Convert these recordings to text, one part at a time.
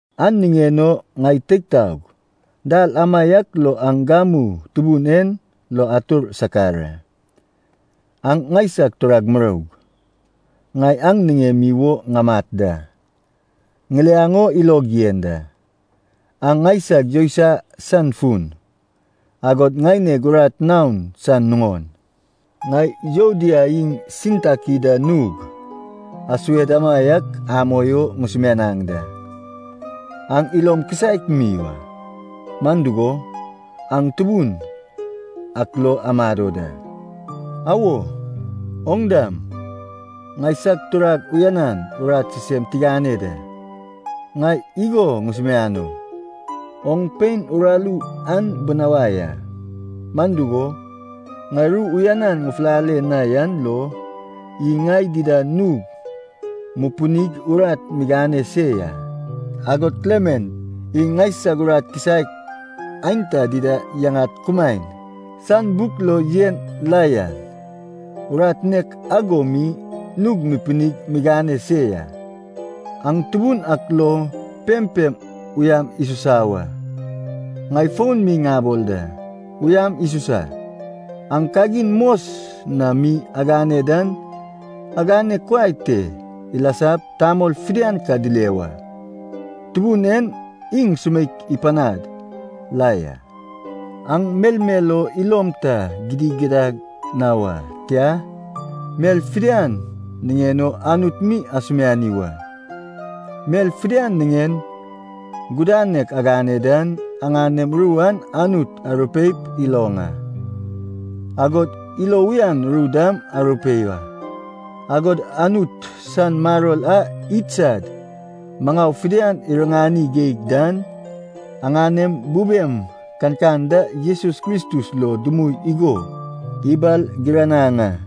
An niŋen o, ŋai teig taog, dal amaiak lo aŋ gamu Tubun en lo atur sakar a. Aŋ ŋaisag turag muroug, ŋai aŋ niŋemi wo ŋamat da, ŋiliaŋ o ilog yen da, aŋ ŋaisag yousai san fun, agod ŋaineg urat naon san nuŋon. Ŋai Yuodia iŋ Sintaki da nug asued amaiak amoi o ŋusumianaŋ da. Aŋ ilom kisaek mi wa, man dugo, aŋ Tubun ak lo amado da. Awo, oŋ dam, ŋaisag turag uyanan urat sisem tigane da, ŋai igo ŋusumiano, oŋ pein uraru an binawai a. Man dugo, ŋai ru uyanan ŋufulale na yan lo, iŋ ŋai dida nug mupinig urat migane se ya. Agod Klement iŋ ŋaisag urat kisaek aenta dida yaŋad kumaen san buk lo yen la yan, urat nek ago mi nug mupinig migane se ya. Aŋ Tubun ak lo pempem uyam isusa wa. Ŋai fon mi ŋabol da, uyam isusa! Aŋ kagin mos na mi agane dan agane kuai te ilasap, tamol fidian ka dile wa. Tubun en iŋ sumeik ipanad la ya. Aŋ melmel o ilom ta gidigidad na wa, tia, mel fidian niŋen o Anut mi asumiani wa. Mel fidian niŋen gudanek agane dan, aŋanem ru an Anut arupeip iloŋ a, agod ilo uyan ru dam arupei wa. Agod Anut san maror a idsad maŋau fidian iriŋani geig dan, aŋanem bubem kankan da Jesus Kristus lo dumui igo ibalgiranaŋ a.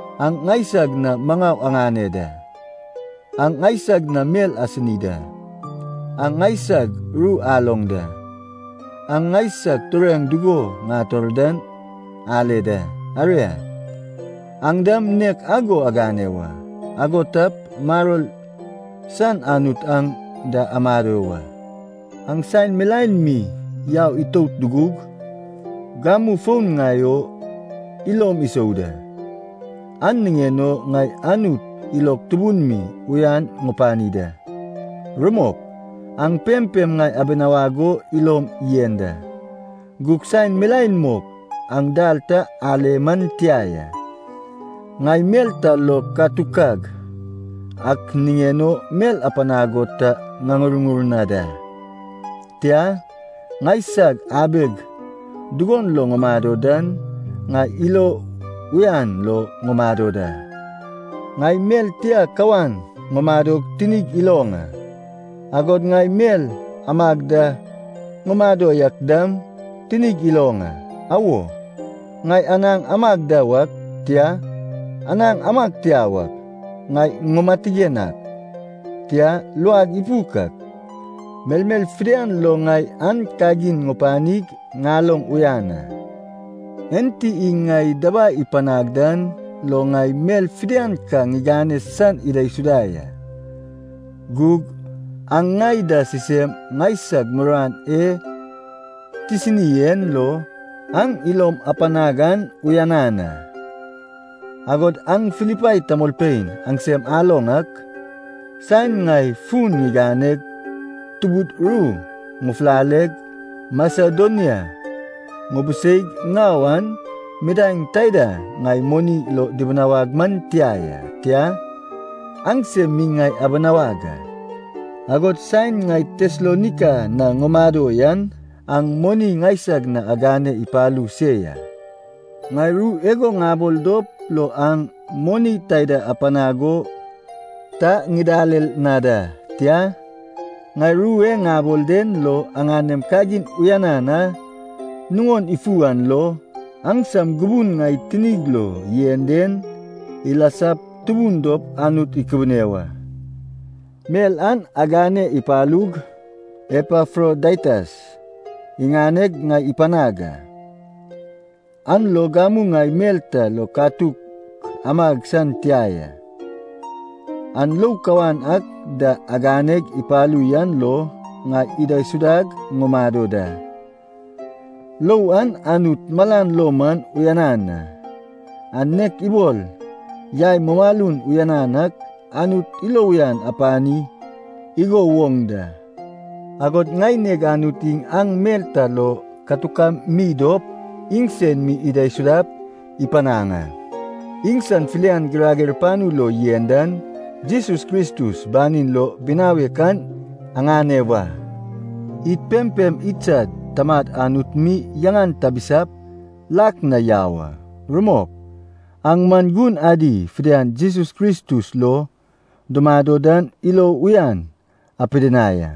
Aŋ ŋaisag na maŋau aŋane da, aŋ ŋaisag na mel asini da, aŋ ŋaisag ru aloŋ da, aŋ ŋaisag tureŋ dugo ŋator dan ale da. Aria, aŋ dam nek ago agane wa, ago tap maror san Anut aŋ da amado wa. Aŋ saen milaen mi yau itout dugug, gamu fon ŋai o ilom isou da. An niŋen o ŋai Anut ilog tubun mi uyan ŋupani da. Rumok, aŋ pempem ŋai abinawag o ilom yen da, gug saen milaen mok aŋ dal ta ale man tia ya. Ŋai mel ta lo katukag ak niŋen o mel apanag o ta ŋaŋurŋur na da. Tia, ŋaisag abeg dugon lo ŋumado dan, ŋai ilo uyan lo ŋumado da. Ŋai mel tia kawan ŋumadog tinig iloŋ a, agod ŋai mel amag da ŋumado yak dam tinig iloŋ a. Awo, ŋai anaŋ amag da wak, tia, anaŋ amag tia wak, ŋai ŋumatigen ak, tia, luag ipuk ak, melmel fidian lo ŋai an kagin ŋupanig, ŋaloŋ uyan a. Enti iŋ ŋai dabai ipanag dan lo ŋai mel fidian ka ŋigane san idaisuda ya. Gug, aŋ ŋai da sisem ŋaisag muruan e tisini en lo, aŋ ilom apanag an uyanan a. Agod aŋ Filipai tamolpein aŋsem aloŋ ak, saen ŋai fun ŋiganeg Tubud ru ŋufulaleg Masedonia ŋubiseig ŋau an midaeŋ taida ŋai moni lo dibinawag man tia ya, tia, aŋsem mi ŋai abinawag a. Agod saen ŋai Tesalonaika na ŋumado yan, aŋ moni ŋaisag na agane ipalu se ya. Ŋai ru igo ŋabol dop lo aŋ moni taida apanag o ta ŋidalel na da. Tia, ŋai ru e ŋabol den lo aŋanem kagin uyanan a nuŋon ifu an lo, aŋsam gubun ŋai tinig lo yen den ilasap tubun dop Anut ikubune wa. Mel an agane ipalug Epafrodaitas iŋaneg ŋai ipanag a, an lo gamu ŋai mel ta lo katuk amag san tia ya. Aŋ lou kawan ak da aganeg ipalu yan lo ŋai idaisudag ŋumado da. Lou an Anut malan lo man uyanan a. An nek ibol yai mumalun uyanan ak, Anut ilo uyan ipani igo woŋ da. Agod ŋaineg Anut iŋ aŋ mel ta lo katukam mi dop iŋsen mi idaisudap ipanaŋ a. Iŋsan filian girager panu lo yen dan Jesus Kristus banin lo binawek an aŋane wa. Id pempem idsad Tamad Anut mi yaŋan tabisap lak na yau a. Rumok. Aŋ man gun adi fidian Jesus Kristus lo dumado dan ilo uyan apidinai a.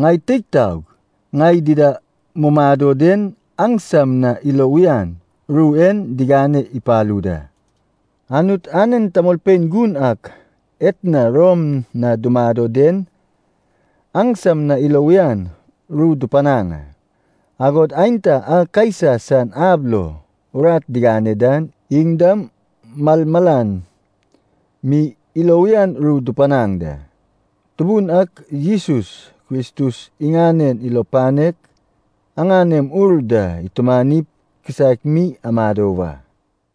Ŋai teig taog, ŋai dida mumado den aŋsam na ilo uyan ru en digane ipalu da. Anut anen tamolpein gun ak etna Rom na dumado den aŋsam na ilo uyan ru dupanaŋ a, agod aenta a Kaisa san ab lo urat digane dan iŋ dam malmalan mi ilo uyan ru dupanaŋ da. Tubun ak Jesus Kristus iŋanen ilo panek aŋanem ur da itumanip kisaek mi amado wa.